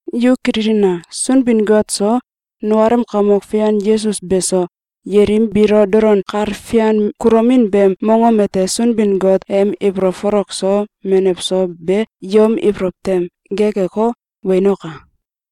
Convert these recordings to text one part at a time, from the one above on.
Yu kililina! Sunbin-Got so, nukalem Kamok Fian Yesus beso, yelim biilo dolon kal fian kulomin beem mongom ete Sunbin-Got em ibolow folok so menew so be yom ibolow tem gekeko, wenoka!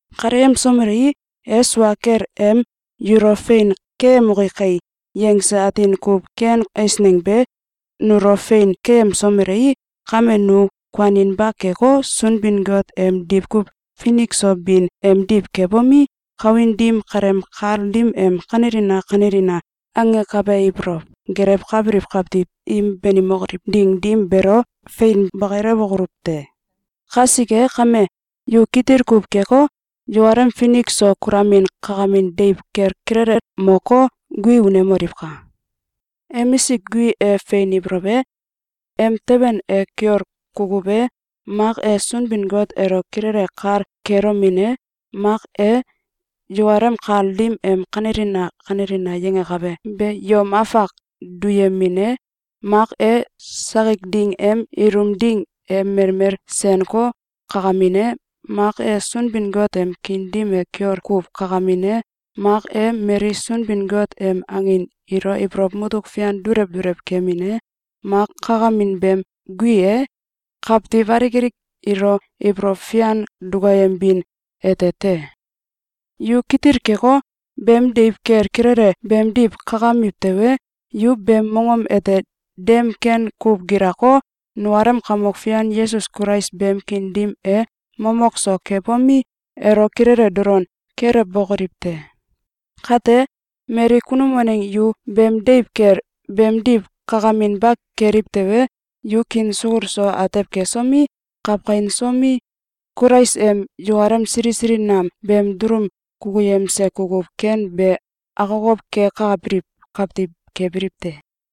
Kaleyemsomelei, e sua kel em “Yulo fein keyemoki kai!”, yangse atin kuw ken eisneng be nulo fein keyemsomelei, kame nu kuaninba keko, Sunbin-Got em diwkuw finik so bin emdiw kebomi, kawin dim kaleem kal dim em “Kanelina! Kanelina!”, angakabe ibolow gelewkabiliw kawtiw im banimokoliw ding dim beelo fein bakilewokoluw te. Kasike kame, yu kitil kuw keko, yukalem finik so kulomin kakamin deiw kel kilelel moko, gui unemoliwka! Emisik guin e fein ibolow e, emteben e kiol kukuw e, mak e Sunbin-Got elo kilele kal kelomin e, mak e, yukalem kal dim em “Kanelina! Kanelina!”, yangakabe be yom afak duyemin e, mak e, sakik ding em ilum ding e melmel senko, kakamin e, mak e, Sunbin-Got em kiin dim e kiol kuw kakamin e, mak e, mali Sunbin-Got em angin ilo ibolow mutuk fian dulew dulew kemin e, mak kakamin beem gui e, kawtiw alik alik ilo ibolow fian dukayembin ete te. Yu kitil keko, beem deiw kel kilele beemdiw kakamiw tewe, yu beem mongom ete dem ken kuw gilako, nukalem Kamok Fian Yesus Kulais beem kiin dim e mamow so kebomi, elo kilele dolon kelewbokoliw te! Kate, mali kunum waneng yu beem deiw kel beemdiw kakaminba keliw tewe, yu kiin sukul so atew kesomi, kawkainsomi, Kulais em yukalem sili sili nam beem dulum kukuyemse kukuw ken be akokow kekabiliw kawtiw kebiliw te.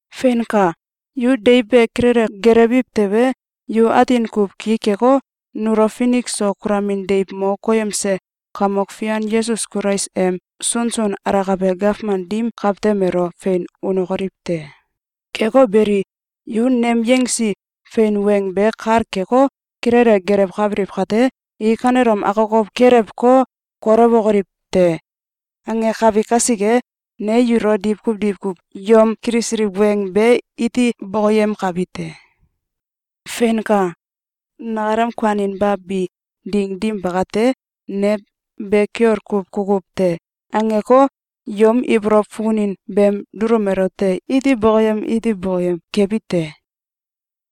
Feinka! Yu deiw be kilele gelewiw tewe, yu atin kuw ki keko, nulo finik so kulomin deiw mo koyemse Kamok Fian Yesus Kulais em sunsun alakabe gawman dim kawtem elo fein unokoliw te. Keko beli, yu nem yangsi fein weng be kal keko, kilele gelewkabiliw kate, “I kanelom akokow kelewko, kolewokoliw te!”, angakabi kasike, ne yulo diwkuw diwkuw yom kilisiliw weng be iti bokoyemkabi te. Feinka! Nakalem kuaninba bi ding dim bakate, ne “Be kiol kuw kukuw te!”, angeko, yom ibolow fukunin beem dulum elote iti bokoyem iti bokoyem kebi te.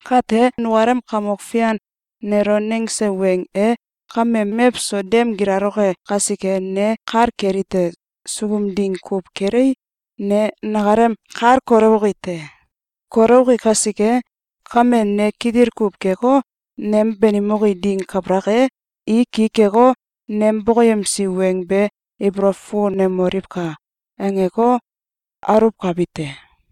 Kate, nukalem Kamok Fian nelo nangse weng e kame mewso dem gilaloke kasike, ne kal kelite: Sukum ding kuw kelei, ne nakalem kal kolewoki te. Kolewoki kasike kame, ne kitil kuw keko, “Nem banimoki ding kabalak e, i ki keko, nem bokoyemsi weng be ibolow fukunemoliwka!”, angeko, aluwkabi te.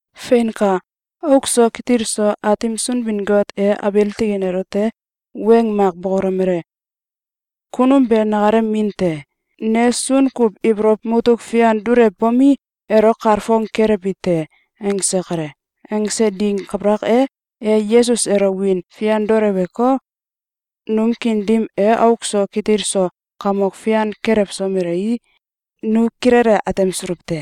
Feinka! Auk so kitil so Aatim Sunbin-Got e abiil tikin elote weng mak bokolomele: “Kunum be nakalem min te. Ne sun kuw ibolow mutuk fian dulewbomi, elo kalfong kelewbi te.”, angse kale. Angse ding kabalak e, e Yesus elo wiin fian duleweko, num kiin dim e auk so kitil so kamok fian kelewsomelei, nu kilele atemsuluw te.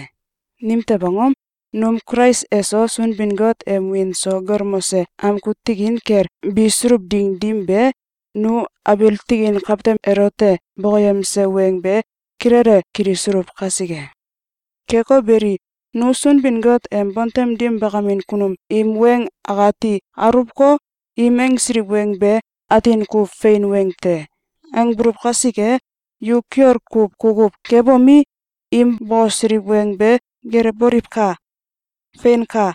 Nimtew angom? Num Kulais eso Sunbin-Got em wiin so galmose amgu tikin kel bisuluw ding dim be, nu abiil tikin kawtem elote bokoyemse weng be kilele kilisuluw kasike. Keko beli, nu Sunbin-Got em bontem dim bakamin kunum im weng akati aluwko, “Im angsiliw weng be atin kuw fein weng te!”, angbuluw kasike, yu kiol kuw kukuw kebomi, im bokosiliw weng be gelewboliwka! Feinka!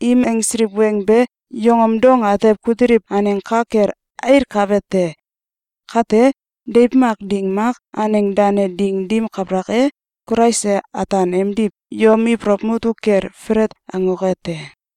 Im angsiliw weng be yongom dong atew kutiliw aneng ka kel ailkabe te. Kate, deiw mak ding mak, aneng dane ding dim kabalak e, Kulais e ataan emdiw yom ibolow mutuk kel felet angoke te.